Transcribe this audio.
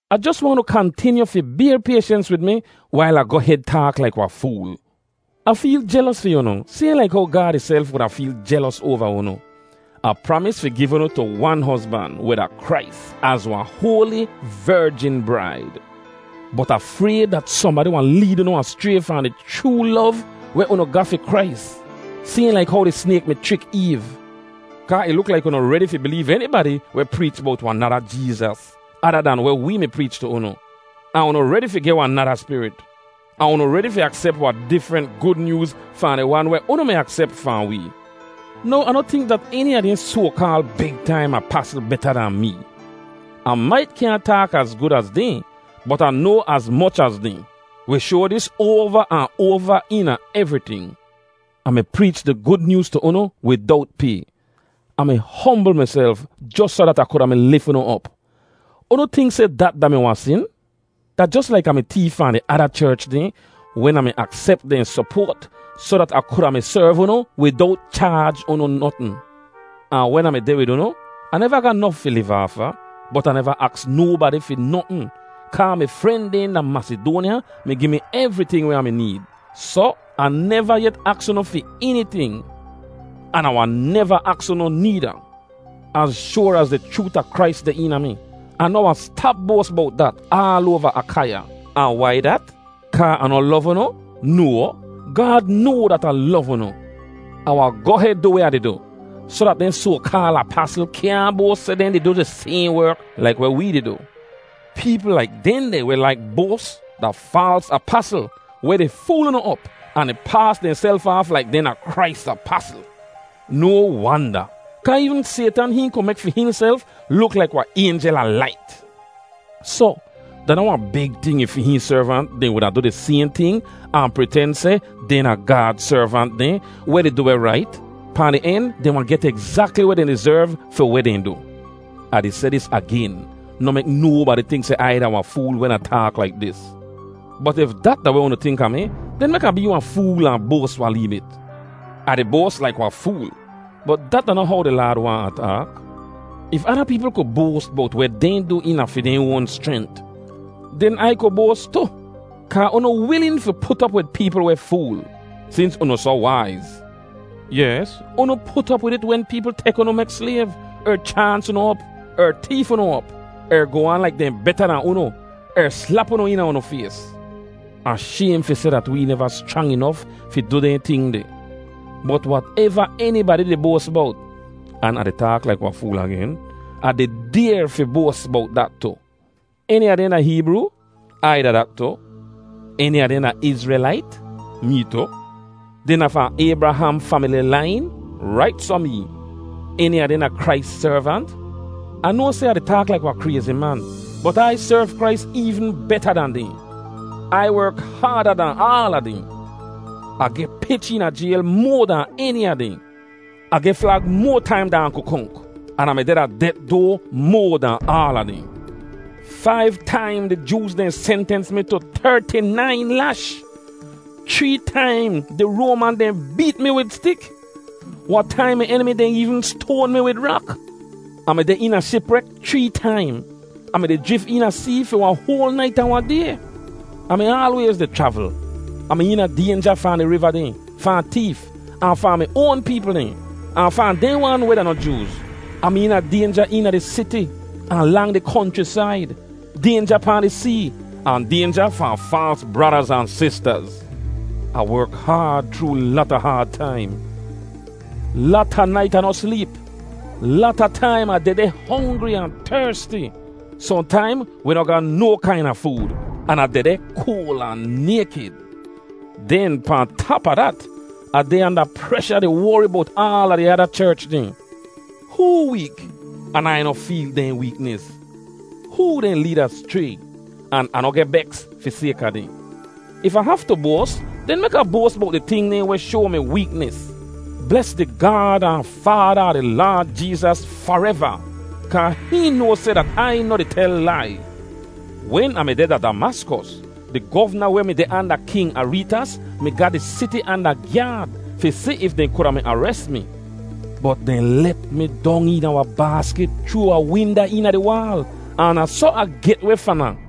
Ah jos waahn unu kantinyu fi bayr payshens wid mi wail Ah goh hed taak laik wahn fool. Ah feel jelos fi unu sayhn laik how Gaad ihself wuda feel jelos oava unu. Ah pramis fi giv unu tu wan hozban, weh da Krais, az wahn hoali, verjin braid. Bot Ah frayd dat sohnbadi wahn leed unu aschray fahn di chroo lov weh unu ga fi Krais, sayhn laik how di snayk mi chrik Eev. Kaa ih luk laik unu redi fi bileev enibadi weh preech bowt wahn nada Jeezas ada dahn weh wee mi preech tu unu. Ahn unu redi fi geh wahn nada spirit, ahn unu redi fi aksep wahn difrent Gud Nyooz fahn di wan weh unu mi aksep fahn wee. Now, Ah noh tink dat eni a dehn soa-kaal “big taim apasl” beta dahn mee. Ah mait kyaahn taak az gud az dehn, bot Ah noa az moch az dehn. Wi shoa dis oava ahn oava eena evriting. Ah mi preech di Gud Nyooz tu unu widowt pay. Ah mi hombl miself jos soh dat Ah kuda mi lif unu op. Unu tink seh dat da-mi wahn sin? Da jos laik Ah mi teef fahn di ada cherch dehn wen Ah mi aksep dehn sopoat soh dat Ah kuda mi serv unu widowt chaaj unu notn. Ahn wen Ah mi deh wid unu, Ah neva ga nof fi liv aafa, bot Ah neva aks nobadi fi notn, kaa mi fren dehn da Masidoanya mi gi mi evriting weh Ah mi need. Soh, Ah neva yet aks unu fi eniting, an Ah wahn neva aks unu needa. Az shoar az di chroot a Krais deh eena mi, Ah noh wahn stap boas bowt dat aal oava Akaiya. Ahn wai dat? Kaa Ah noh lov unu? No, Gaad noa dat Ah lov unu. Ah wahn goh hed du weh Ah di du, soh dat dehn soa-kaal apasl kyaahn boas seh dehn di du di sayhn werk laik weh wee di du. Peepl laik dehndeh weh laik boas da faals apasl weh di fool unu op ahn di paas dehnself aaf laik dehn da Krais apasl. No wanda, kaa eevn Saytan hihn ku mek fi hihnself luk laik wahn aynjel a lait. Soh, da noh wahn big ting if fi hihn servant dehn wuda du di sayhn ting ahn priten seh dehn da Gaad servant dehn weh di du weh rait. Pahn di en, dehn wahn get egzakli weh dehn dizerv fi weh dehn du. Ah di seh dis agen: Noh mek nobadi tink seh Ai da wahn fool wen Ah taak laik dis. Bot if dat da weh unu tink a mi, den mek Ah bee wahn fool ahn boas wahn lee bit. Ah di boas laik wahn fool, bot dat da noh how di Laad waahn Ah taak. If ada peepl ku boas bowt weh dehn du eena fi dehn oan schrent, den Ai ku boas tu. Kaa unu wilin fi put op wid peepl weh fool, sins unu soh waiz. Yes, unu put op wid it wen peepl tek unu mek slayv, er chaans unu op, er teef unu op, er goh aan laik dehn beta dahn unu, er slap unu eena unu fays. Ah shaym fi seh dat wee neva schrang inof fi du dehn ting deh. Bot wateva enibadi di boas bowt—an Ah di taak laik wahn fool agen—Ah di dayr fi boas bowt dat tu. Eni a dehn da Heebroo? Ai da dat tu. Eni a dehn da Izrelait? Mee tu. Dehn da fahn Aybraham famili lain? Rait soh mee. Eni a dehn da Krais servant? Ah noa seh Ah di taak laik wahn krayzi man, bot Ai serv Krais eevn beta dan dehn. Ai werk haada dahn aala dehn; Ah geh pich eena jayl moa dahn eni a dehn; Ah geh flag moa taim dahn Ah ku konk, an Ah mi deh da det doa moa dahn aala dehn. Faiv taim di Jooz dehn sentens mi tu terti-nain lash. Chree taim di Roaman dehn beet mi wid stik. Wahn taim mi enimi dehn eevn stoan mi wid rak. Ah mi deh eena shiprek chree taim; Ah mi deh di jrif eena see fi wahn hoal nait ahn wahn day. Ah mi aalwayz di chravl; Ah mi eena daynja fahn di riva dehn, fahn teef, ahn fahn mi oan peepl dehn, ahn fahn dehn wan weh da noh Jooz. Ah mi eena daynja eena di siti, ahn lang di konchrisaid, daynja pahn di see, ahn daynja fahn faals bradaz ahn sistaz Ah werk haad chroo lata haad taim; lata nait Ah noh sleep; lata taim Ah dehdeh hongri ahn tersti; sohntaim wi noh ga no kaina food, an Ah dehdeh koal ahn naykid. Den pahn tap a dat, Ah deh anda presha di wori bowt aala di ada cherch dehn. Hoo week, an Ai noh feel dehn weeknis? Hoo dehn leed aschray, an Ah noh geh beks fi sayka dehn? If Ah haftu boas, den mek Ah boas bowt di ting dehn weh shoa mi weeknis. Bles di Gaad ahn Faada a di Laad Jeezas fareva, kaa hihn noa seh dat Ai noh di tel lai. Wen Ah mi deh da Damaskos, di govna weh mi deh anda King Areetas mi ga di siti anda gyaad fi si if dehn kuda mi ares mi. Bot dehn let mi dong eena wahn baaskit chroo wahn winda eena di waal, ahn da soh Ah geh weh fahn ahn.